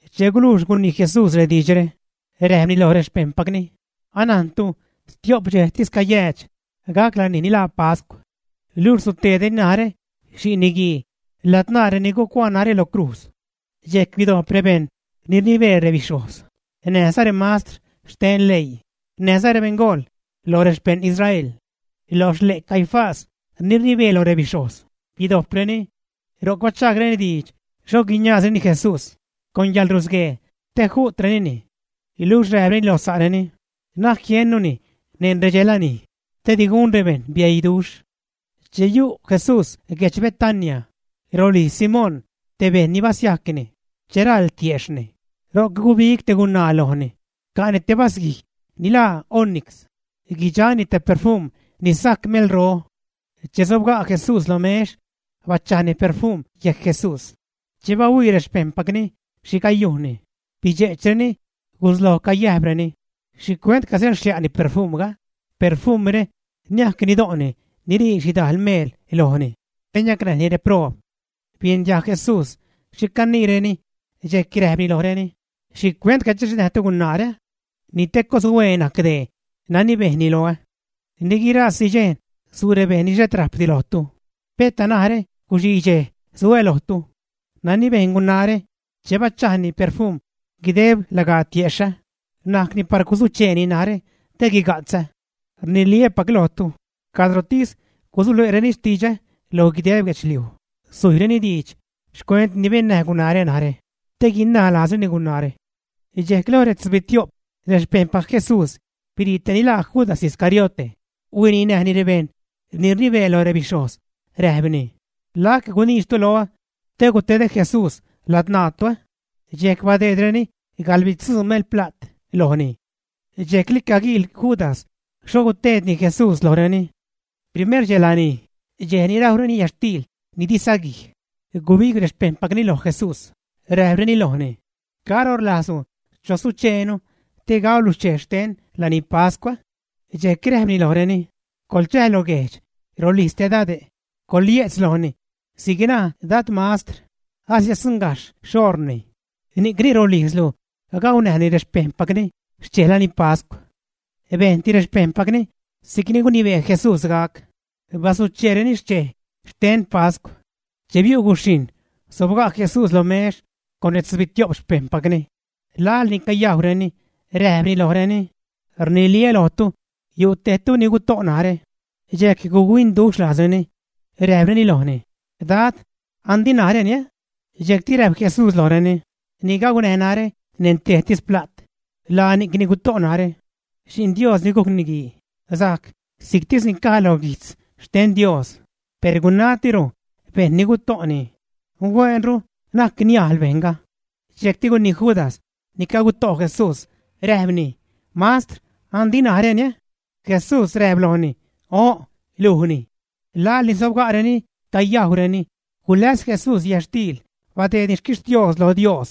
Che gulujx gunii Jesús rediidxre, räjpni loj rexpejṉpacni: ―Anajntu stio'p dxejtis cayäädx gac lanij ni laa pascw. Luxh suteedreni narä, Xi'n Niguii ladzṉaa reni gucuaa narä lo crujz. Dxejc bidojp rebejṉ ni rnibee rebixhojz, näjza remastr xten leii, näjza rebeṉgool lo rexpejṉ Israel. Lo xle' Caifás, ni rnibee loj rebixhojz, bidojpreni. Ro'c bachaagreni diidx xho guiniaazreni Jesús con yäḻrusguee, te ju'trenini. Luxh räjpreni lo sa'reni: ―Na'c jiennuni neṉ redxe lanij, te di gun rebejṉ bieiduxh. Che yu' Jesús guedx Betania, rolijz Simón te bejṉ ni basiajcni che raḻ tiejxhni, ro'c gubig te gunaa lojni, ca'ni te vasguij ni laa onix, guidxani te perfum ni sajc melro. Che sobga' Jesús lo mex, bachajni perfum yejc Jesús. Che bahuii rexpejṉpacni xhi cayujnni, bidxe'chreni, gusloj cayäjpreni: ―¿Xhicuent casäḻxlia'ni perfumga? Perfumre niajc nido'ni, nirii xhidajl meel lojni te niacnäjni rebeṉproob. Biejn diajg Jesús xhi caniireni, dxejc räjpni lojreni: ―¿Xhicuent cadxe'chnäjtu gunaare? Ni te coshueen najc dee nani bejnni loä. Ni guirasi dxej su' rebejṉ ni xhet rajpdi lojtu, peta narä guxii dxej su'ä lojtu. Nani bejn gunaare che bachajni perfumre guideb lagaa tiexhä, najcni par guzucheeni narä te guiga'tzä. Rniliä́pac lojtu, cadrotis gusule'reni xtidxä lo guideb guedxliuj, sujyreni diidx xcuent ni bennäj gunaare narä, te guinaj lajzreni gunaare. Dxejc lo retzubitio'p rexpeṉpac Jesús birii tej ni laa Judas Iscariote, huininäjni rebejṉ ni rnibee loj rebixhojz, räjpni: ―¿Lac guniidxtu loä te gutedä Jesús ladzṉaatu? Dxejc badeedreni gaḻbitzuu melpla't lojni. Dxjecli caguiil Judas xho gutedni Jesús lojreni. Primer dxej lanij, dxej ni rajwreni yätxtiil ni di saguij, gubig rexpejṉpacni loj Jesús, räjpreni lojni: ―¿Caro rlajzlu chozucheenu te gaulu xchej xten lanipascw? Dxejc räjpni lojreni: ―Coḻchäj lo guejdx rolijz te dade', coḻye'tz lojni: “Si'c naj Dad mastr: Asiäddzuṉgajxh xoṟni, ni'cni rolijzlu gaunäjni rexpejṉni xchej lanipascw.” Bejnti rexpejṉpacni si'cni gunibee Jesús gac, bazucheereni xchej xten pascw. Che biu' guxhijṉ, sobga' Jesús lo mex con retzubitio'p xpejṉpacni. Laḻ ni cayajwreni räjpni lojreni: ―Rniliä́ lojtu, yu' tejtu ni guto' narä. Dxejc guc-huinduxh lajzreni, räjpreni lojni: ―Dad, ¿andi naräni? Dxejcti räjp Jesús lojreni: ―Ni gaunäj narä neṉ tejtis pla't, laa ni'cni guto' narä. Xi'n Dios ni gujc Niguii sajc si'ctis ni caj loj guijtz xten Dios, per gunatiro bejṉ ni guto'ni. Huenru na'c niajl bejṉga. Dxejcti gunii Judas, ni caguto' Jesús, räjpni: ―Mastr, ¿andi naräni? Jesús räjp lojni: ―O'n, lujni. Laḻ ni sobga'reni cayajwreni, guläs Jesús yätxtiil, badeedni xquixtios lo Dios,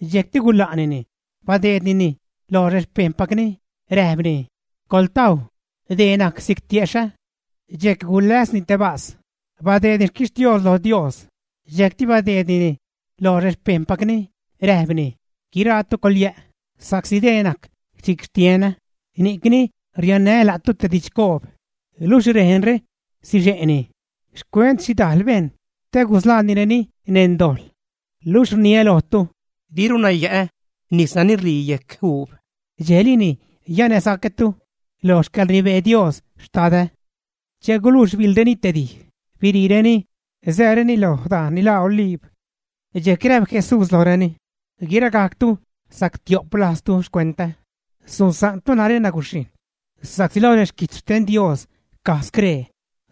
dxejcti gula'nini, badeednini loj rexpejṉpacni, räjpni: ―Coḻtajw; dee najc si'c tiexhä. Dxejc guläsni te vas, badeedni xquixtios lo Dios, dxejcti badeednini loj rexpejṉpacni, räjpni: ―Guiraatu coḻyä', sa'csi dee najc si'c xtienä; ni'cni riannää́ la'tu te didxcoob, luxh rejnre sixe'ni xcuent xhidajl bejṉ te gusḻaanireni neṉ dojḻ. Luxh rniä lojtu, diruna yä'ä nis nani ṟii yejc uub, dxejlini yänäsacätu lo xcäḻrnibee Dios, Xtadä. Che gulujx biḻreni te dij, biriireni, sääreni lo dajn ni laa Oliib. Dxejc räjp Jesús lojreni: ―Guiragajctu sactio'p lajztu xcuentä, susa'ntu narä naguxhijṉ sa'csi lo reguijtz xten Dios caj scree: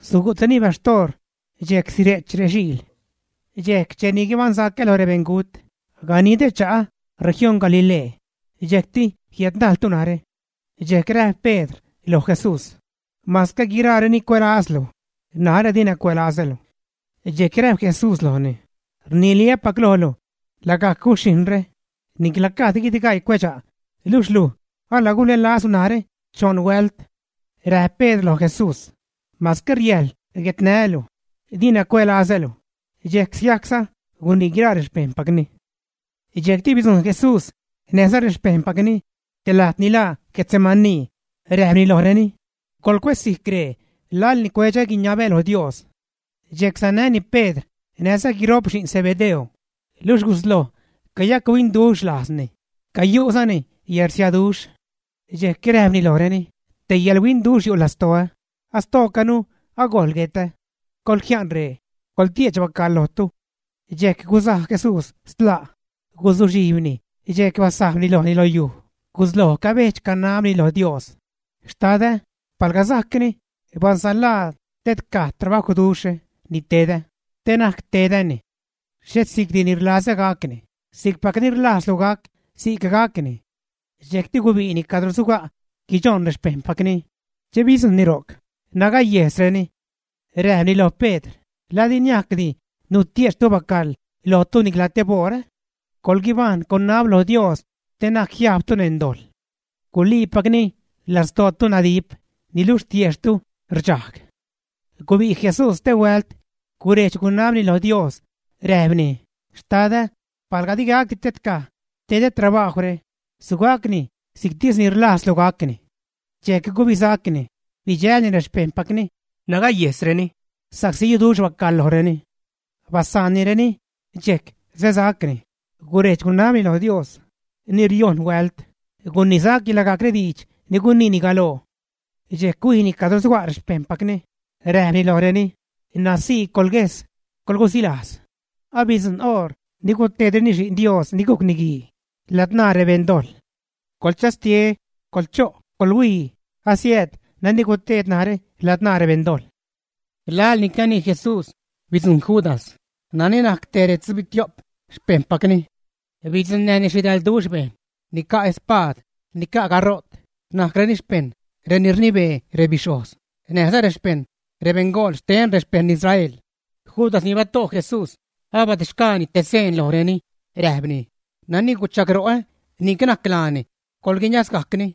“Sugu'treni baxtoor dxejc sire'ch rexiil.” Dxejc cheni guibaṉsacä lo rebeṉgut, ganidä cha'ä región Galilee, dxejcti jiädnajltu narä. Dxejc räjp Pedr loj Jesús: ―Masque guiraareni cuälazlu, narä dina cuälazälu. Dxejc räjp Jesús lojni: ―Rniliä́pac lojlu, lagajc guxhijṉre, nicla gajd guidgaii cuedxa', luxh luj alagulälazlu narä choṉ huält. Räjp Pedr loj Jesús: ―Masque riäjḻ guetnää́lu, dina cuälazälu. Dxejc sigajcza gunii guiraa rexpejṉpacni. Dxejcti bidzujṉ Jesús näjza rexpejṉpacni te lajt ni laa Getsemaní, räjpni lojreni: ―Coḻcuésijc ree laḻ ni cuedx-guiniabä lo Dios. Dxejc sanäni Pedr näjza guiṟo'p xi'n Zebedeo, luxh gusloj cayachuinduxh lajzni, cayu'zani yärsiaduxh. Dxejc räjpni lojreni: ―Te yäḻhuinduxh yu' lastoä; astoocanu agojl guetä. Coḻjia'n ree, coḻtie'ch bacaḻ lojtu. Dxejc guzaj Jesús stla', guzuxhijbni dxejc basajb lojni lo yujli, gusloj cabedx-canabni lo Dios: ―Xtadä, palga sajcni, basanlaa tedcaj trabajwduxhre ni tedä, te na'c tedäni. Xhet si'cdi ni rlazä gacni; si'cpacni rlajzlu gac, si'c gacni. Dxejcti gubi'ni cadro suga' guichoṉ rexpejṉpacni, che bidzujṉni ro'c, nagayejsreni. Räjpni lo Pedr: ―¿La di niajcdi nutie'chtu bacaḻ lojtu nicla teboṟ, ä? Coḻguibajṉ, coḻnab lo Dios te na'c jiajbtu neṉ dojḻ. Guliipacni, lastootu nadip, niluxh tiejxhtu rdxajg. Gubi' Jesús stehuält, gurejdx-gunabni loj Dios, räjpni: ―Xtadä, palga digacdi tedcaj tedä trabajwre, sugacni si'ctis ni rlajzlu gacni. Dxejc gubisacni, bidxälni rexpejṉpacni, nagayejsreni sa'csi yuduxh bacaḻ lojreni. Basaannireni, dxejc säsacni, gurejdx-gunabni lo Dios ni riojṉ huält, gunisacni lagajc rediidx ni guniini galoo. Dxejc huijni cadro suga' rexpejṉpacni, räjpni lojreni: ―¡N̲aj sii, coḻguejs, coḻgusilajz! Abidzujṉ oṟ ni gutedreni Xi'n Dios ni gujc Niguii ladzṉaa rebeṉdojḻ. ¡Coḻchastie, coḻcho', colhuii! Asiääd nani guted narä ladzṉaa rebeṉdojḻ. Laḻni canii Jesús bidzujṉ Judas, nani najc tej retzubitio'p xpejṉpacni. Bidzuṉnäjni xhidalduxh bejṉ ni ca' espaad, ni ca' gaṟo't, najcreni xpejṉ reni rnibee rebixhojz, näjza xpejṉ rebeṉgool xten rexpejṉ Israel. Judas, ni bato' Jesús, abadedxgaani te seen lojreni räjpni: ―Nani guchagro'ä, ni'c najc laani; coḻguiniazgajcni.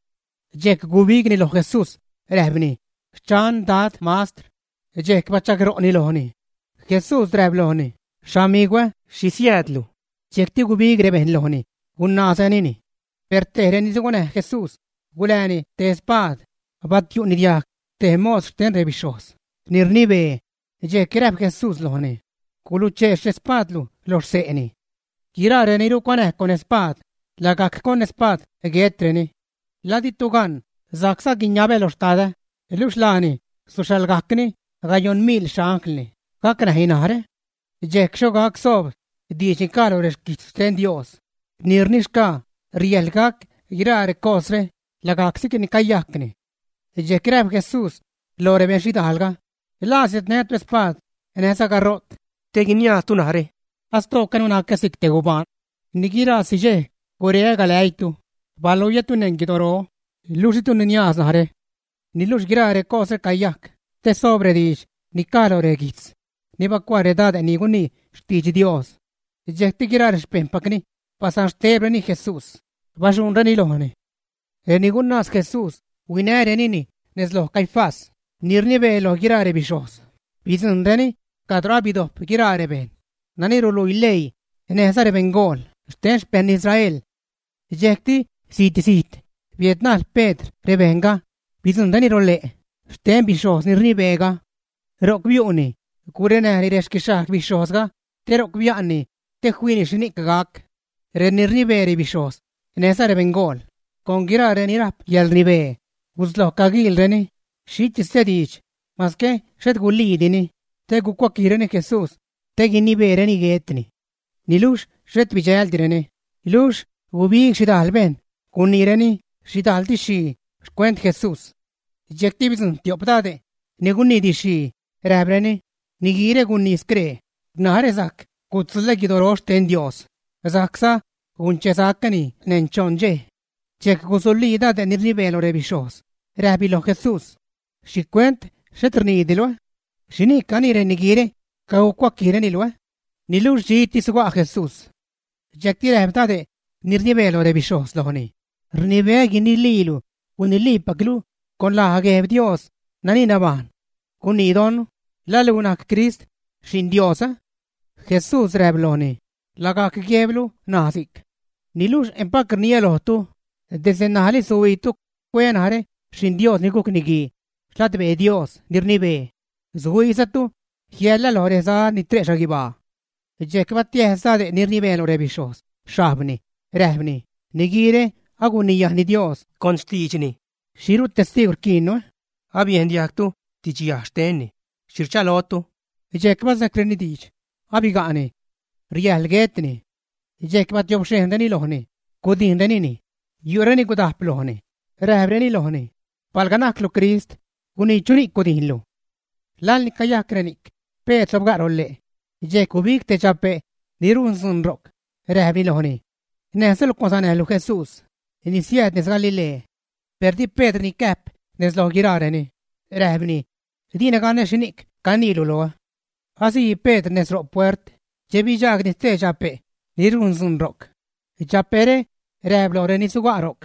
Dxejc gubigni loj Jesús, räjpni: ―Xchan, Dad Mastr. Dxejc bachagro'ni lojni. Jesús räjp lojni: ―Xamigwä, ¿xhi siäädlu? Dxejcti gubig rebejṉ lojni, gunaazrenini. Per tej reni suganäj Jesús gulääni te spaad, batiu'ni diajg te mos xten rebixhojz ni rnibee. Dxejc räjp Jesús lojni: ―Guluchee xspaadlu loj xse'ni. Guiraa reni rucuanäj con spaad, lagajc con spaad guetreni. ¿La ditu gan sajcza guiniabä lo Xtadä, luxh laani suxhaḻgajcni gayoṉbitzubitio'p miḻ xanglni gacnäj narä? Dxejc xho gac soob diidx ni caj lo reguijtz xten Dios ni rnixgaa riäjḻ gac guiraa recosre lagajc si'cni cayajcni. Dxejc räjp Jesús loj rebejṉ xhidajlga: ―¿La siädnätu spaad näjza gaṟo't te guiniaaztu narä astoocanu nacä si'c te gubaan? Ni guirasi dxej gureä galäiitu, baluiätu neṉ guidoro, luxh ditu niniaaz narä. Niluxh guiraa recosre cayajc te soob rediidx ni caj lo reguijtz ni bacuaa redade' ni gunii xtidx Dios. Dxejcti guiraa rexpejṉpacni basanxtebreni Jesús, baxuṉreni lojni. Reni gunaaz Jesús huinänini nez loj Caifás, ni rnibee loj guiraa rebixhojz, bidzujṉreni cadro abidojp guiraa rebejṉ nani ruluii leii näjza rebeṉgool xten xpejṉ Israel. Dxejcti zit-zijt biädnajl Pedr rebejṉga, bidzujṉlireni lole' xten bixhojz ni rnibeega. Ro'c biu'ni, gurenäjni rexquixhajg bixhojzga te ro'c bia'nni te fiini xhini'c gac. Reni rnibee rebixhojz, näjza rebeṉgool con guiraa reni rajp yäḻrnibee gusloj caguiilreni xhitis te diidx, masque xhet guliidini, te gucuaquijreni Jesús te guinibeereni guetni. Niluxh xhet bidxäldireni, luxh gubig xhidajl bejṉ, guniireni xhidajl didx-xhii xcuent Jesús. Dxejcti bidzujṉ tio'p dade' ni gunii didx-xhii, räjpreni: ―Niguiire gunii scree: “Narä sajc gutzuḻä guidoro xten Dios, sajcza gunchesacäni neṉ choṉ dxej.” Dxejc gusulii dade' ni rnibee lo rebixhojz, räjpni loj Jesús: ―¿Xhicuent xhet rniidilu, ä? ¿Xhini'c canii reniguiire cagucuaquijreni luj? Niluxh dxitis suga' Jesús. Dxejcti räjp dade' ni rnibee loj rebixhojz lojni: ―Rnibeä guiniliilu, guiniliipaclu con laj Gueb Dios nani nabajṉ. Gunii don, ¿la luj najc Crist, Xi'n Dios? Jesús räjp lojni: ―Lagajc guejblu naj si'c. Niluxh empac rniä lojtu, desde ṉajli suhuiitu cueä narä Xi'n Dios ni gujc Niguii xladbee Dios ni rnibee, suhuiizatu jiälä lo reza ni tre' xhaguibaa. Dxejc batiäjs dade' ni rnibee loj rebixhojz xhajbni, räjpni: ―¡Niguiire aguniyajni Dios con xtiidxni! ¿Xhiru testiigw rquiinnu? Abiejn diajgtu didxyaj xtenni. ¿Xhi rchalotu? Dxejc basejcreni diidx: ―¡Abiga'ni! Riäjḻ guetni. Dxejc batiobxhejnreni lojni, gudijnrenini. Yu'reni gudajp lojni, räjpreni lojni: ―Palga najclu Crist, gunii chuni'c gudijnlu. Laḻ ni cayajc reni'c, Pedr sobga' lole'. Dxejc gubig te dxape' ni rujn dzuun ro'c, räjpni lojni: ―Näjza luj cuansanäjlu Jesús, ni siääd nez Galilee. Per di Pedr nicäjp nez loj guiraareni, räjpni: ―Dina ganä xhini'c caniilu loä. Asii Pedr nez ro' puert, che bidxaagni stee dxape' ni rujn dzuun ro'c. Dxape're räjp loj reni suga' ro'c: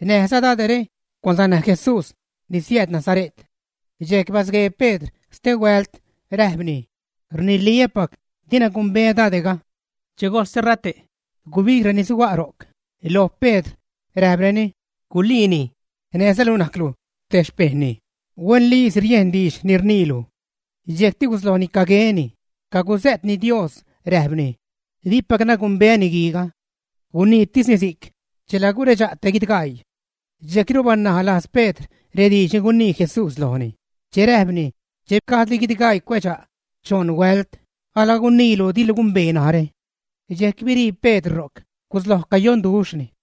―Näjza dade're cuansanäj Jesús ni siääd Nazare't. Dxejc basguee Pedr stehuält, räjpni: ―Rniliä́pac dina gumbeä dade'ga. Che gojl sterate', gubig reni suga' ro'c loj Pedr, räjpreni: ―Guliini; näjza luj najclu te xpejṉni; huenliisi riejn diidx ni rniilu. Dxejcti guslojni cagueni, caguzä'tni Dios, räjpni: ―Dipacna gumbeä niguiiga. Guniitisni si'c, chela guredxa' te guidgaii. Dxejcru banalajz Pedr rediidx ni gunii Jesús lojni che räjpni: “Che gajdli guidgaii cuedxa', choṉ huält alaguniilu dilu gumbee narä.” Dxejc birii Pedr ro'c, gusloj cayonduxhni.